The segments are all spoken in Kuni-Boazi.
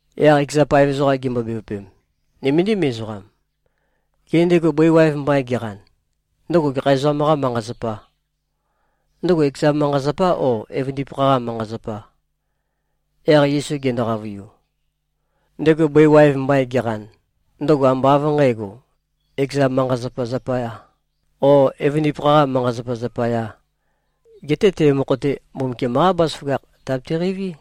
Yaq ekeza paev ezoqam gimbo-bevøpem, “Nøméndim ezoqam. Gê, ndego bøi waev mbain geqan, ndøgo gekha ezoqam-qâ manqa-zapà? Ndøgo ekezâ manqa-zapà, ó, evøndipakha-qâ manqa-zapà?” Yaq Yesu gendo-qavøiu, “Ndego bøi waev mbain geqan, ndøgo ambá av nqǣgo, ekeza manqa-zapa zapayā, o evøndipakha-qā manqa-zapa zapayā. Geté te mokho-te, Mbumbukiam-qá bazaføgakh tabete-qeiví.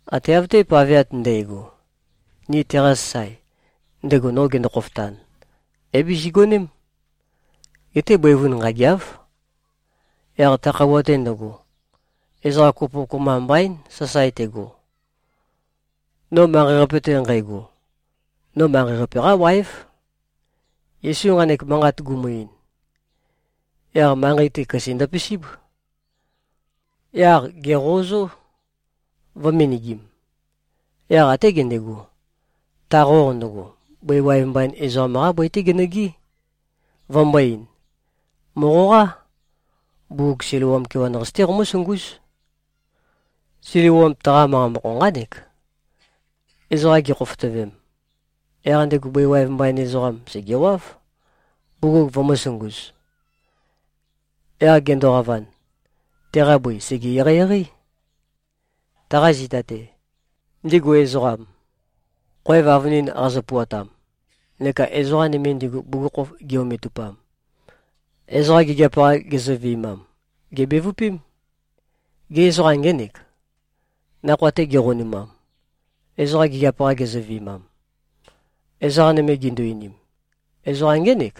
Ate av-te paveat ndægo, ni teqa sasae, ndego no gendo-khofotan, é-bizigoném. Geté bøivun nqâgeáv. Yaq ta khøuwa-te ndøgo, ezoqa kopo kopømba mbaín, sasae tego. No manqei-qape-te nqægo, no manqei-qape-qá wáev.” Yesu nqanek manqat gumu-ein, yaq manqei-te, køse ndøpisíb. Yaq gèqøozó, vø̄-menegim. Yaq até gendego, ta qoq ndøgo, bøi waev mbain ezoqam-qá bøi-té genøgɨ́, vømbō-ein, “Mòqoqá. Bugug Siloam kewan-qasi-té qomǿsungúz.” (Siloam, taqa manqa mokho nqánek, “Ezoqam gikhofotøvem.”) Yaq ndego bøi waev mbain ezoqam, sègewáv, bugug vømø̄sunguz. Yaq gendoqavan, teqa bøi sège-eqeieqeí. Taqa zita-te, ndigu ezoqam, khoev avønin qazø-puatam neka ezoqa nøme ndigu bugukhokhof gi-ometupam, ezoqa gigiap-qa gezøvi꞉mam, gèbevøpém, “Gê, ezoqam ngénèk, nakhoa-te geqonumam, ezoqa gigiap-qa gezøvi꞉mam?” Ezoqa nøme gindu-einim, “Ezoqam ngének.”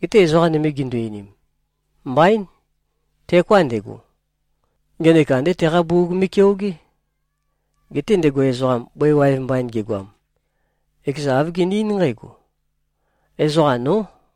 Geté ezoqa nøme gindu-einim, “Mbaín. Teoká ndego. Ngenek andé teqa bugug me꞉keogé.” Geté ndego ezoqam, bøi waev mbain gegoam, ekezan āv gene-eín nqǽgo, “Ezoqam nó.”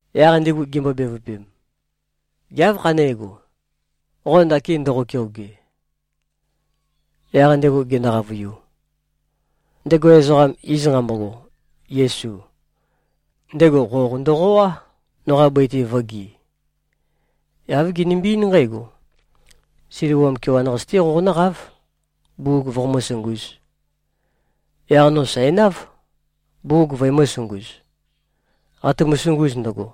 Yaq ndigu gimbo-bevøpem, “Gê, áv khanégo, qo ndakin ndoqo-keoge?” Yaq ndego gendo-qavøiu, “Ndego ezoqam, iz nqambogo Yesu, ndego qoq ndøqoá, noqa bøi-te vō꞉ge. Yaq āv genømbe-eín nqǽgo, ‘Siloam kewan-qasi-té qonǿqáv, bugug voqomǿ-sungūz.’ Yaq no sæ̀náv, bugug vøemø̄-sunguz. Qatumu-sunguz ndøgo,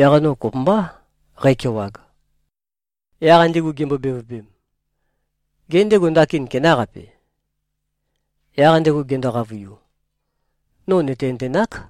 yaq no kopømbá qækewag.” Yaq ndigu gimbo-bevøpem, “Gê, ndego ndakin kenáqape?” Yaq ndego gendo-qavøiu, “No nø̀tenøtenák.”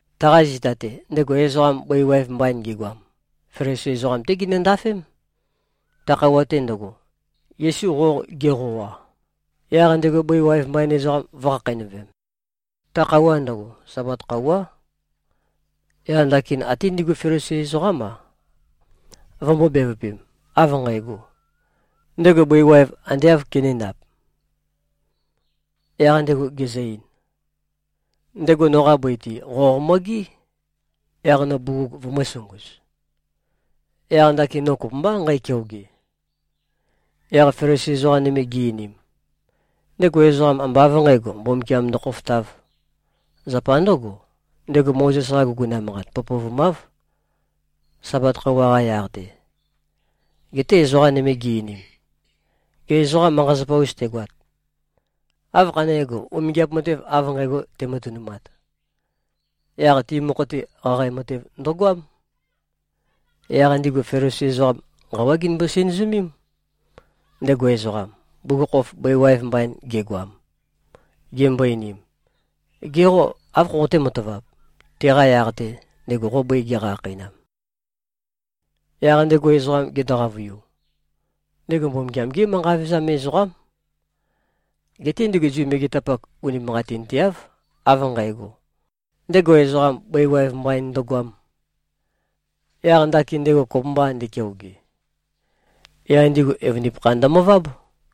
Taqa zita-te, ndego ezoqam, bøi waev mbain gegoam, Felisi ezoqam-té ginøndafém. Ta khøuwa-te ndøgo, Yesu qoq geqoa, yaq ndego bøi waev mbain ezoqam vø̄khakheinøvem, ta khøuwa ndøgo, Sabat khøuwá. Yaq ndakin até ndigu Felisi ezoqám-a, vømbō-bevøpem, av nqægo, ndego bøi waev ande āv kenēndap? Yaq ndego gezø-ein, “Ndego noqa bøi-te, qoq mo꞉gé, yaq no bugug vøemø̄-sunguz. Yaq ndakin no kopømbá nqækeoge.” Yaq Felisi ezoqa nøme gi-einim, “Ndego ezoqam, ambá av nqǣgo, Mbumbukiam ndokhofotāv. Zapa ndǿgo, ndego Mozes-qa guguna manqat pøpøvumáv, Sabat khøuwa-qa yaq-te.” Geté ezoqa nøme gi-einim, “Gê, ezoqa manqa-zapa-us tegoat, áv khané꞉go, umingiap matev av nqægo tematønumat?” Yaq ti mokho-te, qaqae matev ndøgoám. Yaq ndigu Felisi ezoqam, nqawá ginømbo-sinøzømém, ndego ezoqam, bugukhokhof bøi waev mbain gegoam. Gimbo-einim, “Ge qô, áv khoqoté-matavap, teqa yaq-te, ndego bøi geqa-khakheinam?” Yaq ndego ezoqam gendo-qavøiu, “Ndego Mbumbukiam-gé manqa vevezam ezoqám.” Geté ndigu Zu megetapak unimanqatinteáv, av nqægo, ndego ezoqam bøi waev mbain ndøgoām, yaq ndakin ndego kopømbā ndekeoge. Yaq ndigu evøndipakha ndømøváb.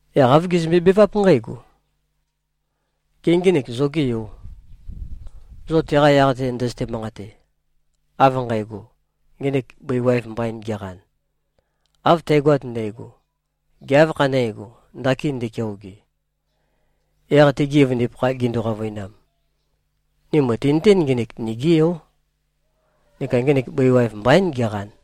Yaq āv gezømbe-beváp nqǽgo, “Gê, ngenek zogé yō, zo teqa yaq-te ndøzøte-manqate, av nqægo, ngenek bøi waev mbaín geqan? Av tægoat ndægo, gê, áv khané꞉go, ndakin ndekeoge?” Yaq tegi evøndipakha gindu-qavøinam, “Ni mø̀tinøtén, ngenek nigí yó, neka ngenek bøi waev mbaín geqan.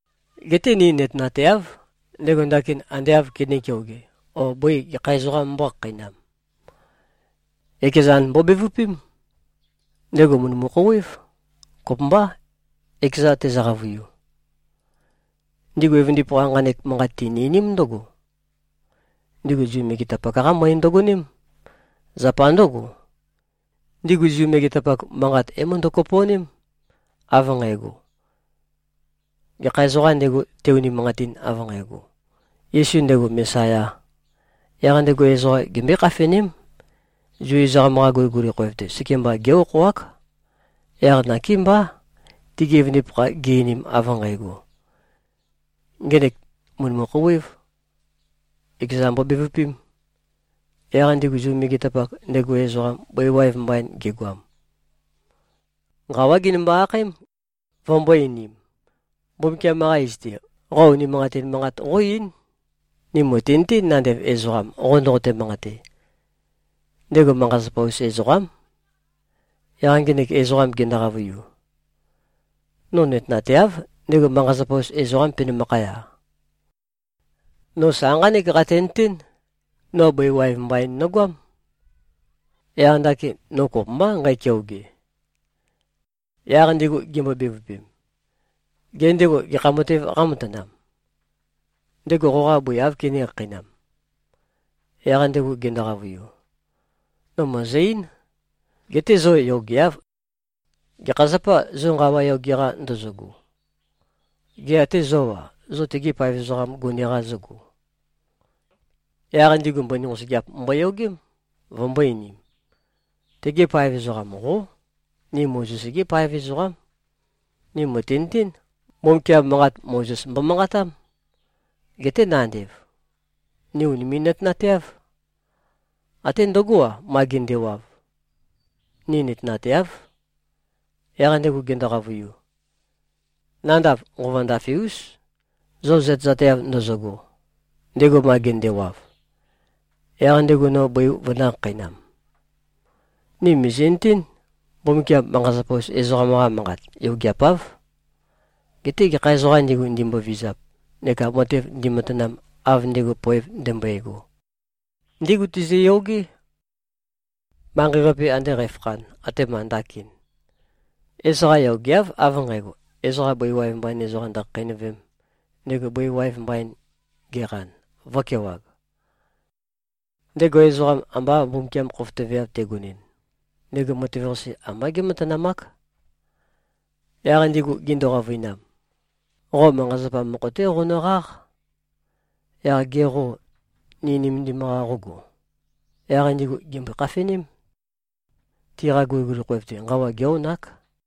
Geté ni nøtenateáv, ndego ndakin ande āv kenē-keoge o bøi gekha ezoqām mbōkhakheinam. Ekezan mbobevøpém! Ndego mø̀ndømu-khouwév. Kopømbá, ekeza tezø-qavøiu.” Ndigu evøndipakha, nqanek manqat tini-einím ndǿgo, ndigu Zu megetapak-qá møe ndøgoném. Zapa ndǿgo, ndigu Zu megetapak, manqat é-møndø-kopo꞉ném, av nqægo, gekha ezoqām ndego, te-unimanqatin, av nqægo, Yesu ndego Mesayā, yaq ndego ezoqam gembøé-khafeném. Zu ezoqam-qa guliguli khoev-te, sekemba gé-okhoák. Yaq nakémbá, tegi evøndipakha gi-einim av nqægo, “Ngenek mø̀ndømu-khouwēv. Ekeza mbobevøpēm.” Yaq ndigu Zu megetapak, ndego ezoqam, bøi waev mbain gegoam, nqawá ginømbo-akhaém, vømbō-einim, “Mbumbukiam-qa iz-te, qo unimanqatin manqat qó-eín. Ni mø̀tinøtén, nandev ezoqam qo ndoqote-manqate, ndego manqa-zapa-us ezoqám.” Yaq ngenek ezoqam gendo-qavøiu, “No nøtenateáv, ndego manqa-zapa-us ezoqām penømakhaya. No sa nqánek qatenøtén. No bøi waev mbain nogoám. Yaq ndakin no kopømbá nqækeoge.” Yaq ndigu gimbo-bevøpem, “Gê, ndego gekha matev qámatanam? Ndego qoqa bøi áv kené-khakheinam?” Yaq ndego gendo-qavøiu, “No mø̀ezø-eín. Geté zo yogeáv. Gekha zapâ, zo nqawa yoge-qa ndozogo? Gê, ate zó-a, zo tegi paev ezoqam gone-qa zógo?” Yaq ndigu mbøni nqosøgeap mboyogém, vømbō-einim, “Tege paev ezoqam, qó. Ni Mozes-gí paev ezoqám. Ni mø̀tinøtén, Mbumbukiam manqat Mozes mbomanqatám. Geté nandev, ni ùnimi꞉-nøtenateáv. Até ndøgó-a, ma gendewav, ni nøtenateáv.” Yaq ndego gendo-qavøiu, “Nandav nqova ndafe-ús, zo zøtezateav ndozogo, ndego ma gendewav, yaq ndego no bøi vønø̄-khakheinam. Ni mìzi꞉nøtén, Mbumbukiam manqa-zapa-us ezoqam-qa manqat yogeapáv. Geté gekha ezoqām ndigu, ndimbovizap neka matev ndimatanam, av ndego poev ndømbøego, ndígu tezøyogé. Manqei-qape ande qæfakhan, atema ndakin, ezoqa yogeáv av nqægo, ezoqa bøi waev mbain ezoqam ndøkhakheinøvēm, ndego bøi waev mbain geqan, vǿkewāg. Ndego ezoqam, amba Mbumbukiam khofotøveav tegonɨn, ndego matev-qase ambá gé꞉matanamák.” Yaq ndigu gindu-qavøinam, “Qo manqa-zapa mokho-té qonøqáq. Yaq ge qô, ni nømendim-qa qógo?” Yaq ndigu gèmbøe-khafeném, tiqa guliguli khoev-te nqawa gé-onák.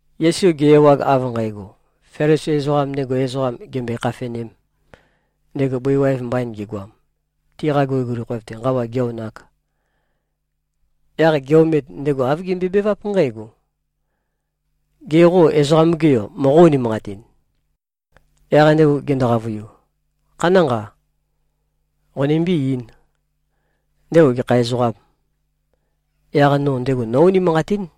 Yesu ge-ewag, av nqægo, Felisi ezoqam ndego ezoqam gèmbøe-khafenēm, ndego bøi waev mbain gegoam, tiqa guliguli khoev-te nqawa gē-onāk, yaq ge-omet, ndego āv gembøebeváp nqǽgo, “Gê, qo Ezoqam-ge Yo moqó-unimanqatin?” Yaq ndego gendo-qavøiu, “Khanánqa. Qonømbé-eīn, ndego gekha ezoqâm? Yaq no ndego nó-unimanqatín!”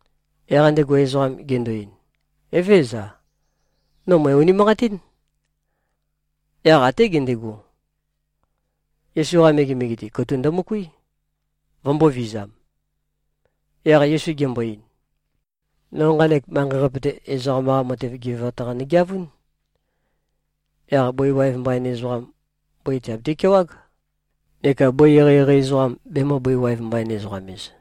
Yaq ndego ezoqam gendo-ein, “Evézøza. No mø̀e-unimanqatín!” Yaq até gendego, Yesu-qa megemege-te, katuk ndømøkuí, vømbōvizam. Yaq Yesu gembo-ein, “No nqanek manqei-qape-te, ezoqam-qa matev gevewat-qa nøgeavún. Yaq bøi waev mbain ezoqam, bøi tìabiti-kewág, neka bøi eqeieqei ezoqam, bemø̄-bøi-waev-mbain-ezoqam-ez.”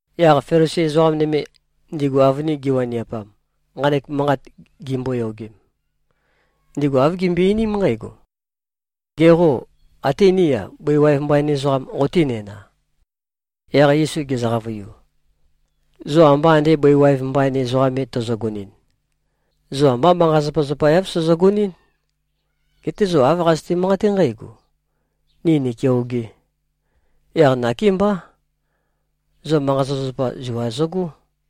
Yaq Felisi ezoqa nøme, ndigu avønin giwaniapam, nqanek manqat gimboyogem, ndigu āv gimbøe-einím nqǽgo, “Ge qô, até ní-a, bøi waev mbain ezoqam qotínæna?” Yaq Yesu gezø-qavøiu, “Zo amba ande bøi waev mbain ezoqam me tozogonɨn, zo ambá manqa-zapazapa-yav sozogonɨ́n. Geté zo āv qazøte-manqaté nqǽgo, ‘Ni nìkeogé.’ Yaq nakémbá, zo manqa-zapazapa zua zøgó.”